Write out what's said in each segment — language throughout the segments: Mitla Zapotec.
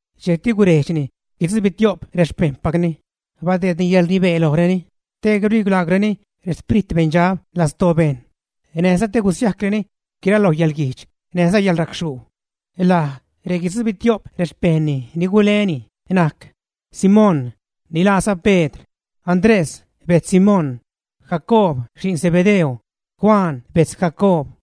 Dxejcti gurejdxni guitzubitio'p rexpejṉpacni, badeedni yäḻrnibee lojreni te gurilaagwreni rexprit beṉdxab lastoo bejṉ näjza te gusiajcreni guiraloj yäḻguijdx näjza yäḻracxhuu. Laj reguitzubitio'p rexpejṉni ni guleni najc: Simón, ni laaza Pedr; Andrés bejtz Simón; Jacoob xi'n Zebedeo; Juan bejtz Jacoob;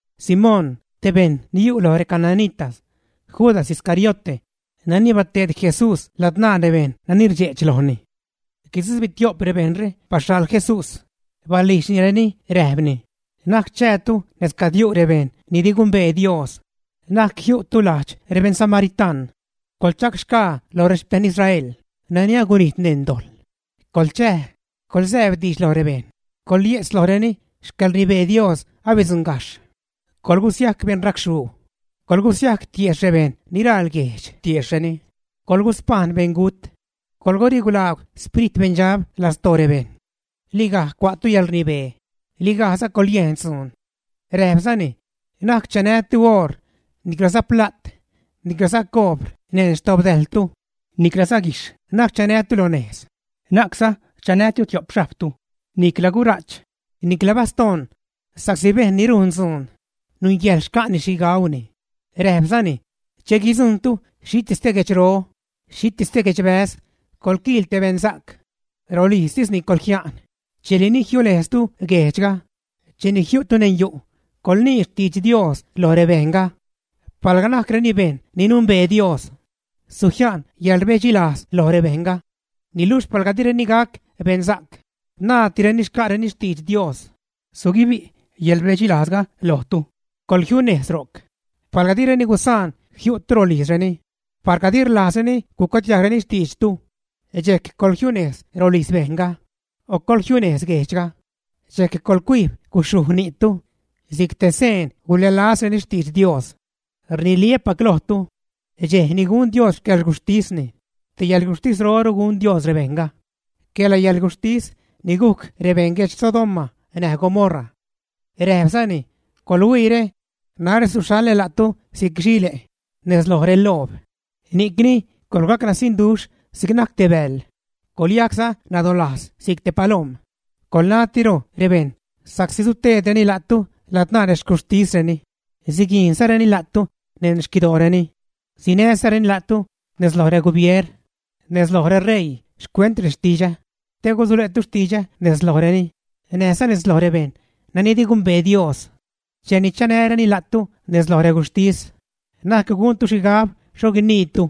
Simón, te bejṉ ni yu' loj recananita; Judas Iscariote, nani bateed Jesús ladzṉaa rebejṉ nani rdxe'ch lojni. Guitzubitio'p rebejṉre baxhaḻ Jesús. Balijdxnireni räjpni: ―Na'c chäätu nez cad yu' rebejṉ ni di gumbee Dios. Na'c jiu'tu lajdx rebeṉ samaritaṉ. Coḻchäxgaa lo rexpejṉ Israel nani agunijt neṉ dojḻ. Coḻchäj, coḻzäbdiidx lo rebejṉ, coḻye'tz lojreni xcäḻrnibee Dios abidzuṉgajxh. Coḻgusiajc beṉ racxhuu, coḻgusiajc tiejxh rebejṉ ni raḻ guejch tiejxhreni, coḻguspajṉ beṉgut. Coḻgurilaagw xprit beṉdxab lastoo rebejṉ. Ligaj cua'tu yäḻrnibee, ligajza coḻyejn dzuun. Räjpzani: ―Na'c chanätu oor, niclaza pla't, niclaza coobr neṉ xdobdäjltu, niclaza guijxh na'c chanätu lo nejz. Na'cza chanätu tio'p xhajbtu, nicla gura'ch, nicla bastoṉ sa'csi bejṉ ni rujn dzuun nungäjḻ xca'ni xhi gauni. Räjpzani: ―Che guidzujṉtu xhitis te guedxro, xhitis te guedxbäz, coḻquiil te beṉsa'c. Rolijztisni coḻjia'n dxejli ni jiunejztu guejdxga. Cheni jiu'tu neṉ yu', coḻnii xtidx Dios lo rebejṉga. Palga najcreni bejṉ ni numbee Dios, sujia'n yäḻrbedxilajz loj rebejṉga. Niluxh palga direni gac beṉsa'c, naaddireni xca'reni xtidx Dios, suguibi' yäḻrbedxilajzga lojtu, coḻjiunejz ro'c. Palga direni gusaan jiu'tu rolijzreni, palga di rlajzreni gucuadiajgreni xtiidxtu, dxejc coḻjiunejz rolijz bejṉga, o coḻjiunejz guejdxga, dxejc coḻcuijb guxhuj ni'tu si'c te seen gulälazreni xtidx Dios. Rniliä́pac lojtu, dxej ni gun Dios xcäḻguxhtisni, te yäḻguxhtisroru gun Dios rebejṉga, quela yälguxhtis ni gujc rebeṉ guedx Sodoma näj Gomorra. Räjpzani: ―¡Coḻhuiire! Narä suxhaḻä la'tu si'c xile' nez loj reloob, ni'cni coḻgacnasiṉduxh si'c najc te bäḻ, coḻyajcza nadolajz si'c te palom. Coḻnatiro rebejṉ sa'csi suteedreni la'tu ladzṉaa rexcuxhtisreni, siguijnzareni la'tu neṉ xquidooreni. Sinäzareni la'tu nez loj regubier, nez loj reṟeii xcuent rextidxä, te gusule'tu xtidxä nez lojreni näjza nez loj rebejṉ nani di gumbee Dios. Cheni chanäreni la'tu nez loj reguxhtis, na'c guntu xhigab xho guiniitu,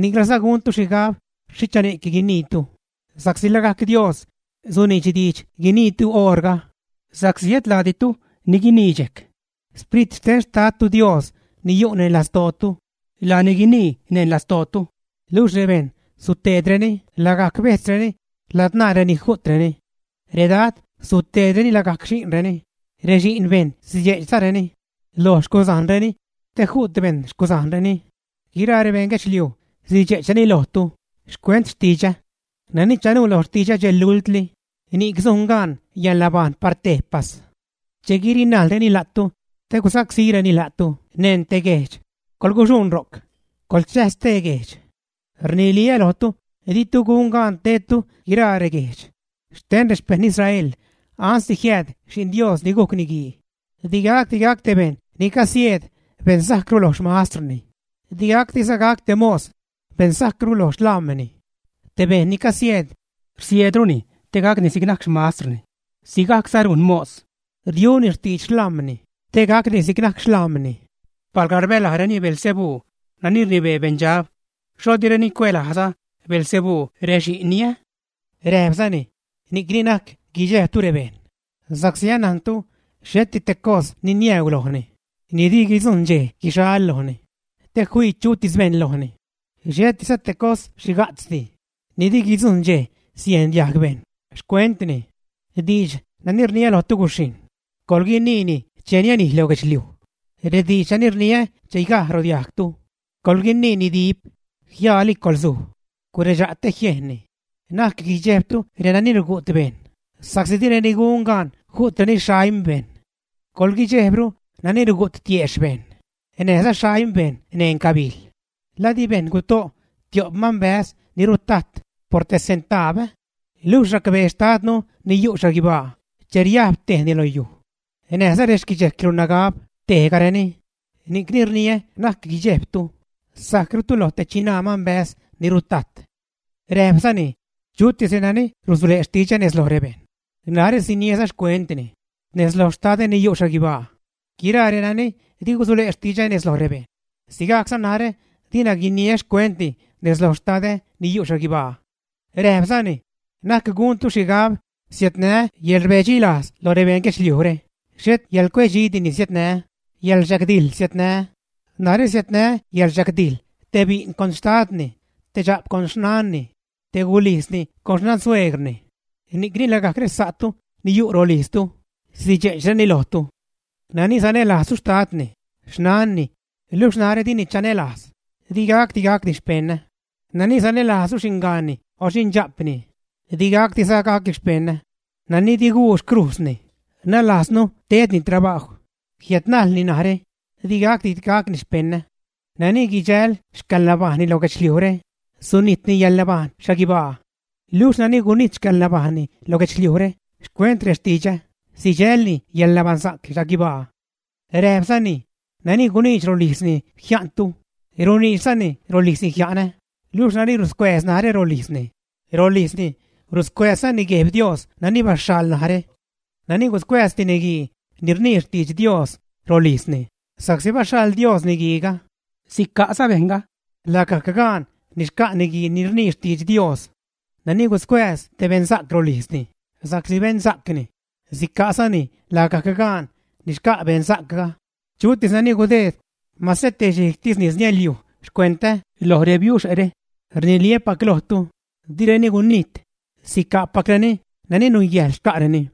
niclaza guntu xhigab xhicha ni'c guiniitu, sa'csi lagajc Dios suniidx diidx guiniitu oṟga. Sa'csi et la'ditu ni guinii dxejc, Sprit xten Xtadtu Dios ni yu' neṉ lastootu, laani guinii neṉ lastootu. ’Luxh rebejṉ suteedreni lagajc bejtzreni ladzṉaa reni ju'treni. Redad suteedreni lagajc xi'nreni, rexi'n bejṉ sidxe'chzareni lo xcuzajnreni te ju't bejṉ xcuzajnreni. Guiraa rebejṉ guedxliuj sidxe'chreni lojtu xcuent xtidxä. Nani chanuu lo xtidxä dxej lultli, ni'c sujn gaan yäḻnabajṉ par tejpas. Che guirinajlreni la'tu te gusacsíreni la'tu neṉ te guejdx, coḻguxuṉ ro'c, coḻchäj stee guejdx. Rniliä lojtu, ditu gun gaan tedtu guiraa reguejdx xten rexpejṉ Israel ansde jiääd Xi'n Dios ni gujc Niguii. ’Di te bejṉ ni casieedgaj beṉroru lo xmastrni, diza te mos gac beṉroru lo xlam̲ni. Te bejṉ ni casieed, rsieedruni te gacni si'c najc xmastrni, sigajcza rujn mos, riuni xtidx xlam̲ni te gacni si'c najc xlam̲ni. Palga rbälajreni Beelzebú nani rnibee beṉdxab, ¿xho direni cuälajza Beelzebú rexi'nni, ä? Räjpzani: ―Ni'cni na'c guidxejbtu rebejṉ, sa'csi anajntu xheti te cos ni niäuu lojni ni di guidzujṉ dxej guixal lojni, te fii chutis bejṉ lojni. Xhetiza te cos xhiga'tzdi ni di guidzujṉ dxej siejn diajg bejṉ xcuentni. Diidx nani rniä lojtu guxhijṉ, coḻguiniini che nianij lo guedxliuj. Rediidx nani rniä chigaj rodiajgtu, coḻguiniini dip, jiaali coḻzuj, guredxa' te jiejnni. Na'c guidxejbtu renani rugu't bejṉ, sa'csi direni gun gaan ju'treni xaim bejṉ. Coḻguidxejbru nani rugu't tiexh bejṉ näjza xaim bejṉ neṉ gabijl. ’¿La di bejṉ guto' tio'p manbäz ni rutajt por te centaab, ä? Luxh racbee Xtadnu ni yu' xhaguibaa che riajb tejni lo yuj. Näjza rexquidxejclu nagab tebgajreni. Ni'cni rniä na'c guidxejbtu; sajcrutu lo te chinaa manbäz ni rutajt. Räjpzani: ―Chutis renani rusule' xtidxä nez loj rebejṉ, narä siniäza xcuentni nez loj xtadä ni yu' xhaguibaa. Guiraa renani di gusule' xtidxä nez loj rebejṉ, sigajcza narä dina guiniä xcuentni nez loj xtadä ni yu' xhaguibaa. Räjpzani: ―Na'c guntu xhigab siädnää́ yäḻrbedxilajz lo rebeṉ guedxliujre, xhet yäḻcuedxidi ni siädnää́, yäḻrdxagdijḻ siädnää́. Narä siädnää́ yäḻrdxagdijḻ te bi'n con xtadni; te dxa'p con xnanni; te gulijzni con xnansueegrni. Ni'cni lagajc resa'tu ni yu' rolijztu sidxe'chreni lojtu. ’Nani sanälajzru xtadni, xnanni, luxh narä dini chanälajz, digacdi gacni xpeṉä; nani sanälajzru xingaanni o xindxa'pni, di gacdiza gacni xpeṉä. Nani di guu xcrujzni, nalajznu tedni trabajw, jiädnajlni narä, di gacdi gacni xpeṉä. Nani guidxäl xcäḻnabajṉni lo guedxliujre, sunitni yäḻnabajṉ xhaguibaa. Luxh nani gunijt xcäḻnabajṉni lo guedxliujre xcuent rextidxä, sidxälni yäḻnabaṉsa'c xhaguibaa. Räjpzani: ―Nani guniidx rolijzni jia'ntu, runiidxzani rolijzni jia'nä; luxh nani ruscuääz narä rolijzni, rolijzni ruscuääzzani Gueb Dios nani baxhaḻ narä. Nani guscuääz te niguii ni rnii xtidx Dios rolijzni sa'csi baxhaḻ Dios niguiiga, sica'za bejṉga lagajc gaan ni xca' niguii ni rnii xtidx Dios. Nani guscuääz te beṉsa'c rolijzni sa'csi beṉsa'cni, sica'zani lagajc gaan ni xca' beṉsa'cga. Chutis nani gudeed mase te xhijgtis nis niäḻiuj xcuentä lo rebiuxe're, rniliä́pac lojtu, direni gunijt, sica'pacreni nani nungäjḻ xca'reni.